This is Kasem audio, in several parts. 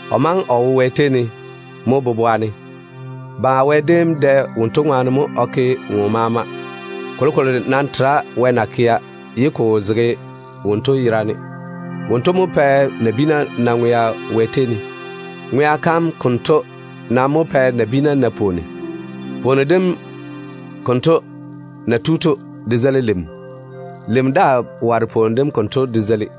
O maŋe o wo Wɛ tei ne mo boboa kam ne. Baŋa Wɛ déem dɛ wonto ŋwaane mo o ke wonnu maama. Kolokolo nam tera Wɛ na kea, ye ko wo zege wonto yera ne. Wonto mo pɛ nabiina na ŋwea. Ŋwea kam konto nam ta mo pae nabiina na pwooni. Pwooni dem konto na tu to, de zeili lim. Lim daa ware pwooni dem konto de zeili.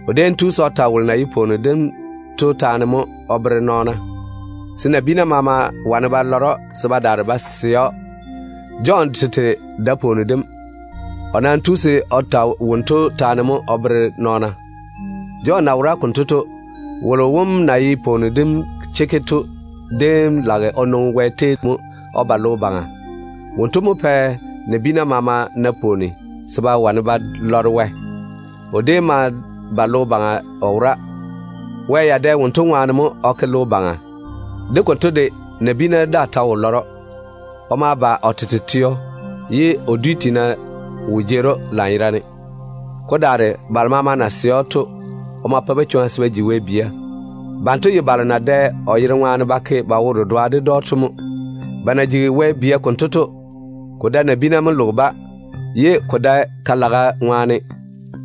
O déem tu se o ta wolo na ye pwooni dem to taane mo o bere nɔɔna, se nabiina maama wane ba lɔre‑o se ba daare ba sɛ‑o. Jɔn tete dae pwooni dem. O nam tu se o ta wonto taane mo o bere nɔɔna. Jɔn na wora konto to, wolo wom na ye pwooni dem chekke to déem lage o nwoŋi Wɛ tei mo o ba logo baŋa. Wonto mo pae nabiina maama na pwooni se ba yia wane ba poore. O déem ma ba logo baŋa o wora. Wɛ ya dɛ o ŋwaane mo o ke logo baŋa. De konto de, nabiina daa ta wo lɔre‑o. O ma ba o tete teo, ye o dwi tiina wo jeeri‑o lanyerane. Ko daare balo maama na sɛ‑o to, o ma pa-ba chwoŋa se ba ji Wɛ bia. Banto ye balo na dɛ o yere ŋwaane ba ke ba wo-dedoa ded‑o to mo. Ba na jigi Wɛ bia konto to, ko dae nabiina mo loge-ba, ye ko dae ka-laga ŋwaane,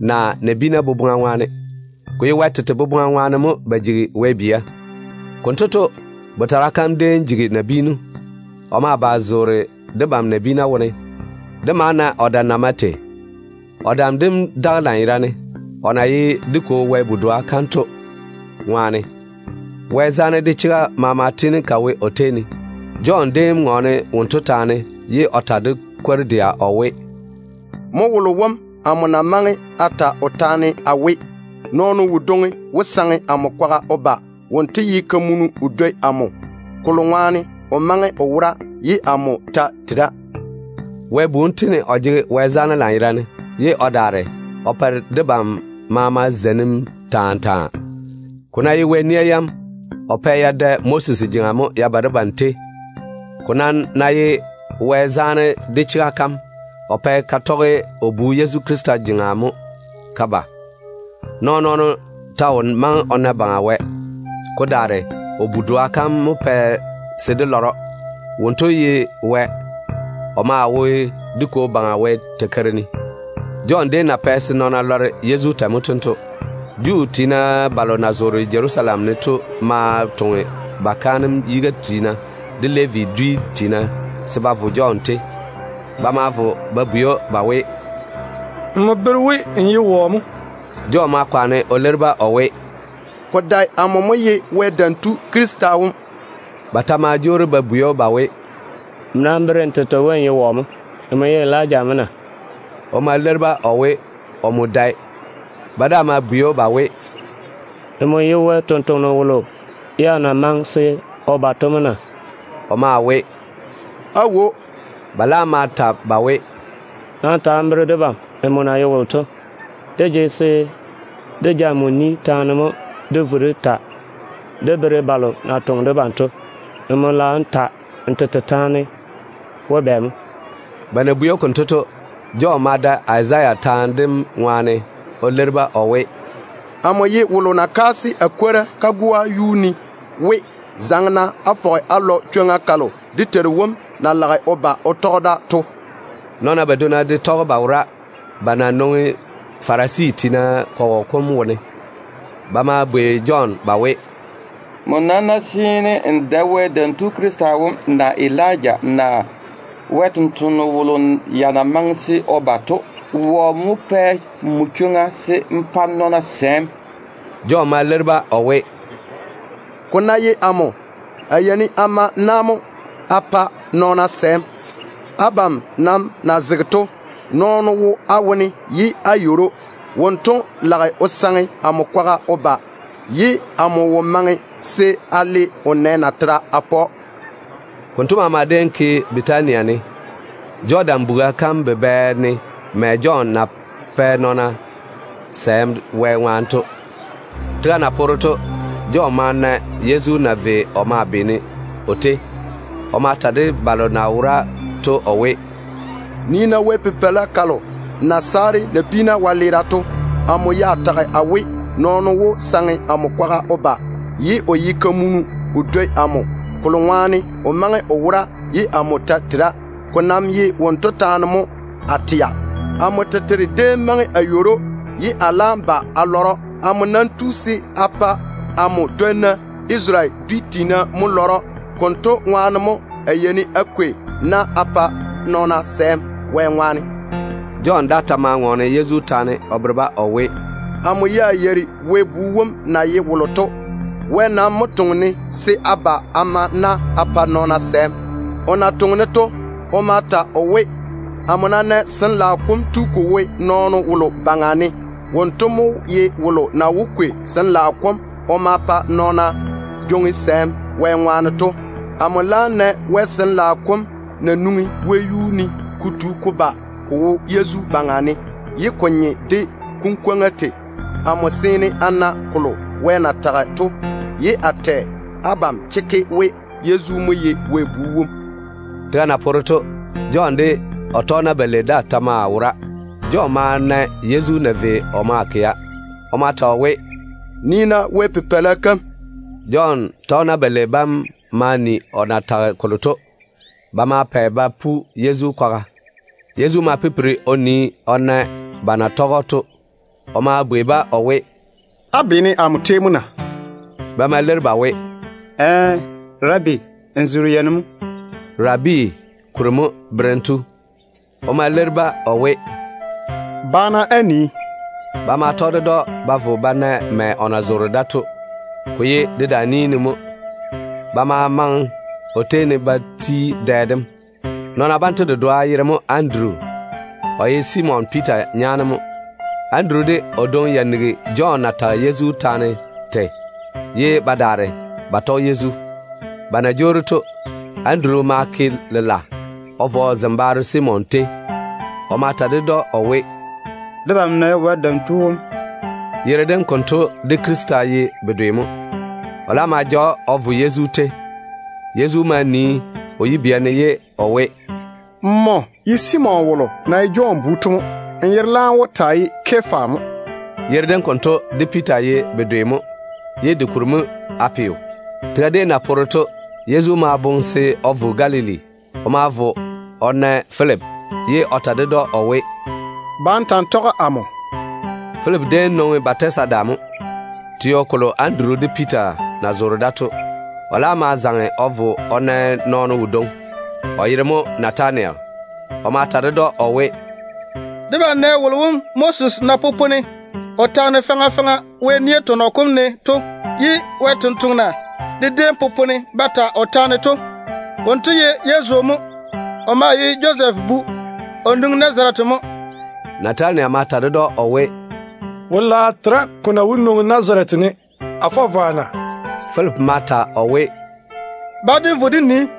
naa nabiina boboŋa ŋwaane. Ko ye Wɛ tete boboŋa ŋwaane mo ba jigi Wɛ bia. Konto to, Botara kam déem jigi nabiinu. O ma ba o zoore debam nabiina wone. Dé ma na o dam na mae tei. O dam dem daga lanyerane, o na ye dé Kwo Wɛ Bu-doa kam to ŋwaane. Wɛ zaane de chega maama tiini te wo o tei ne. Jɔn déem ŋɔɔne wonto taane, ye o ta de kwor-dɛa o we, “Mo wolo wom amo na maŋe a ta o taane a we, Nɔɔno wodwoŋi wó saŋe amo kwaga o ba. Wonto ye kamunu o dwoi amo, kolo ŋwaane o maŋe o wora ye amo ta tera.” Wɛ Bu wom tiini o jege Wɛ zaane lanyerane, ye o daare o pae debam maama zeinim taa taa. Ko ná ye Wɛ nia yam, o déem pɛ ya tɔge Moses jeŋa mo ya ba debam tei. Ko nam ná ye Wɛ zaane de o chega kam, o pɛ te tɔge o Bu Yezu Krista jeŋa mo te ba. Nɔɔn-nɔɔno ta wo maŋe o na Baŋa Wɛ. Ko daare o Bu-doa kam mo pɛ se dé lɔre‑o. Wonto ye Wɛ. O maa wo dé Kwo Baŋa Wɛ takeiri ne. Jɔn déem na pɛ se nɔɔna lɔre Yezu tei to mo tento. Juu tiina balo na zoore Jerusalem ne to ma toŋe ba kaanem yiga tiina, de Levi dwi tiina se ba vo Jɔn tei. Ba ma vo ba bwei‑o ba we, “Nmo bere we n ye wɔ mo?” Jɔn ma yɔɔre o leiri-ba o we, “Ko dae amo mo ye Wɛ Dam Tu Krista wom.” Ba ta ma jwoori ba bwei‑o ba we, “Nmo nam bere n tete we n ye wɔ mo? Nmo ye Elija mo na?” O ma leiri-ba o we, omo dae. Ba daa ma bwei‑o ba we, “Nmo ye Wɛ sampwora kalo ya na maŋe se o ba to mo na?” O maa we, “Aawo.” Ba laam ma ta ba we, “Nam ta n bere debam nmo na ye wolo to. Dé jege se dé ja nmo ni taane mo dé vo dé ta dé bere balo na toŋe debam to. Nmo lage n ta n tete taane we bɛ mo?” Ba na bwei‑o konto to, Jɔn ma da Wɛ sampwora Izaya taane dem ŋwaane o leiri-ba o we, “Amo ye wolo na kaase a kwora kagoa yuu ne we: ‘Pa-na se chwoŋa kalo dé Teiru wom na lage o ba o tɔge da to fɔge ka yɔɔre lanyerane.’” Nɔɔna badwonna de tɔge ba wora, ba na nwoŋi Farisi tiina kɔgɔ kom wone. Ba ma bwei Jɔn ba we, “Nmo nam ná seene n dae Wɛ Dam Tu Krista wom, naa Elija, naa Wɛ sampwora kalo ya na maŋe se o ba to, wɔ mo pɛ nmo chwoŋa se n pa nɔɔna sɛɛm?” Jɔn ma leiri-ba o we, “Ko ná ye amo, a yeini a ma na mo a pa nɔɔna sɛɛm. Abam nam na zege to, nɔɔno wo á wone ye á yeiri‑o. Wonto lage o saŋe amo kwaga o ba, ye amo wo maŋe se a le o nɛ natera a pa‑o.” Konto maama déem ke Bɛtania ne, Jɔdan buga kam bubɛ ne mɛ Jɔn na pae nɔɔna sɛɛm Wɛ ŋwaane to. Tega na poore to, Jɔn ma na Yezu na vei o maa beene o tei. O ma ta de balo na wora to o we, “Nii-na Wɛ Pipeila kalo na saare nabiina wɛleera to. Amo ya tage a we, ‘Nɔɔno wó saŋe amo kwaga o ba, ye o ye kamunu o dwoi amo, kolo ŋwaane o maŋe o wora ye amo ta tera.’ Ko nam ye wonto taane mo a tɛa. Amo tete déem maŋe a yeiri‑o, ye a laam ba a lɔre‑o. Amo nam tu se a pa amo dwonna Isarele dwi tiina bam mo lɔre‑o. Konto ŋwaane mo a yeini a kwei na a pa nɔɔna sɛɛm Wɛ ŋwaane.” Jɔn daa ta ma ŋɔɔne Yezu yera taane o bere-ba o we, “Amo ya yeiri Wɛ Bu wom na ye wolo to. Wɛ nam mo toŋe-ne se a ba a ma na a pa nɔɔna sɛɛm. O na toŋe-ne to, o ma ta o we, amo ná nɛ Sin-laao kom tu ko wo nɔɔno wolo baŋa ne, wonto mo ye wolo na wó kwei Sin-laao kom o ma pa nɔɔna jwoŋi sɛɛm Wɛ ŋwaane to. Amo laam nɛ Wɛ Sin-laao kom na nwoŋi wɛyuu ne ko tu ko ba ko wo Yezu baŋa ne, ye ko nye de kunkwoŋa tei. Amo seene a na kolo Wɛ na tage to, ye a tɛ abam chekke we Yezu mo ye Wɛ Bu wom.” Tega na poore to, Jɔn de o tɔgena balei daa ta maa wora. Jɔn ma na Yezu na vei o maa kɛa. O ma ta o we, “Nii-na Wɛ Pipeila kam.” Jɔn tɔgena balei bam ma ni o na tage kolo to. Ba ma pɛ ba pu Yezu kwaga. Yezu ma pipiri o nii o na ba na tɔge‑o to. O ma bwei-ba o we, “Á beene amo tei mo na?” Ba ma leiri ba we, “Ɛɛ, Rabi, n zoore yei ne mo?” (‘Rabi’ kuri mo ‘Berem tu’.) O ma leiri-ba o we, “Ba-na á nii.” Ba ma tɔge ded‑o ba vo ba na mɛ o na zoore to. Ko ye dedaan-ni ne mo. Ba ma maŋe o tei ne ba ti dɛ dem. Nɔɔna banto dedoa yere mo Anduru. O ye Simon Piita nyaane mo. Anduru de o dwoŋi ya nigi Jɔn na tage Yezu taane tei, ye ba daare ba tɔge Yezu. Ba na jwoori to, Anduru ma ke lela o vo o zembaaro Simon tei. O ma ta ded‑o o we, “Debam nɛ Wɛ Dam Tu wom.” (Yere dem konto de ‘Krista’ ye bedwe mo.) O laam ma ja‑o o vo Yezu tei. Yezu ma nii o yibia ne ye o we, “Nmo ye Simon wolo na ye Jɔn bu to mo. Nmo yere laam wó taa ye Kefa mo.” Yere dem konto de Piita ye bedwe mo. Yere dem kuri mo ye ‘Pelɔrɔ’. Tega déem na poore to, Yezu ma ja boboŋa se o vo Galili. O ma vo o na Filipi, ye o ta ded‑o o we, “Ba n ta‑n tɔge amo.” Filipi déem nwoŋi Bɛtasida mo, teo kolo Anduru de Piita na zoore da to. O laam ma zaŋe o vo o na nɔɔno wodwoŋi, o yere mo Natanayel. O ma ta ded‑o o we, “Debam nɛ wolo wom Moses na popone o taane faŋa faŋa Wɛ nia tɔnɔ kom ne ye Wɛ sampwori de déem popone ba ta o taane to. Wonto ye Yezu mo. O maa ye Josɛf bu. O nwoŋi Nazarete mo.” Natanayel ma ta ded‑o o we, “Wo-laao tera ko na wó nwoŋi Nazarete ne. A fɔ vwa na?” Filipi ma ta o we, “Nam ba se dé vo dé nii.”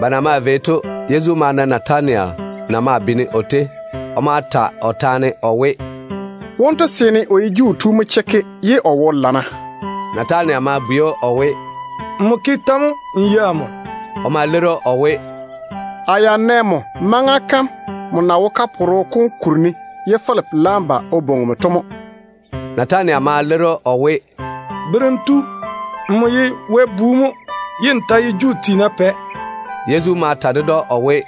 Ba na maa vei to, Yezu ma na Natanayel na maa beene o tei. O ma ta o taane o we, “Wonto seene o ye Juu tu mo chekke, ye o wo lana.” Natanayel ma bwei‑o o we, “Nmo ke tɛ mo n yei amo?” O ma leiri‑o o we, “A ya nɛ nmo maŋa kam nmo na wo kaporo kom kuri ne ye Filipi laam ba o bwoŋi‑m to mo.” Natanayel ma leiri‑o o we, “Berem tu, nmo ye Wɛ Bu mo, ye n ta ye Isarele dwi tiina Pɛ.” Yezu ma ta ded‑o o we,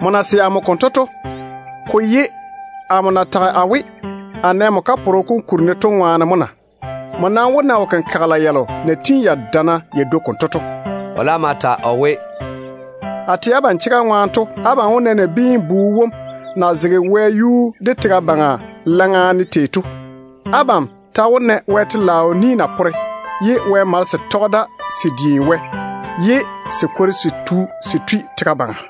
“Nmo na sɛ amo konto to, ko ye amo na tage a we, a nɛ nmo kaporo kom kuri ne to ŋwaane mo na? Nmo nam wó na wo-kenkagela yalo na tiini ya dana ya dwoi konto to.” O laam ma ta o we, “A tɛ abam chega ŋwaane to, abam wó na Nabiin-bu wom na zege wɛyuu de tega baŋa laŋa ne tei to. Abam ta wó na Wɛ telaao ni na pore, ye Wɛ malese tɔge da se diini wɛ, ye se kwori se tu se tui tega baŋa.”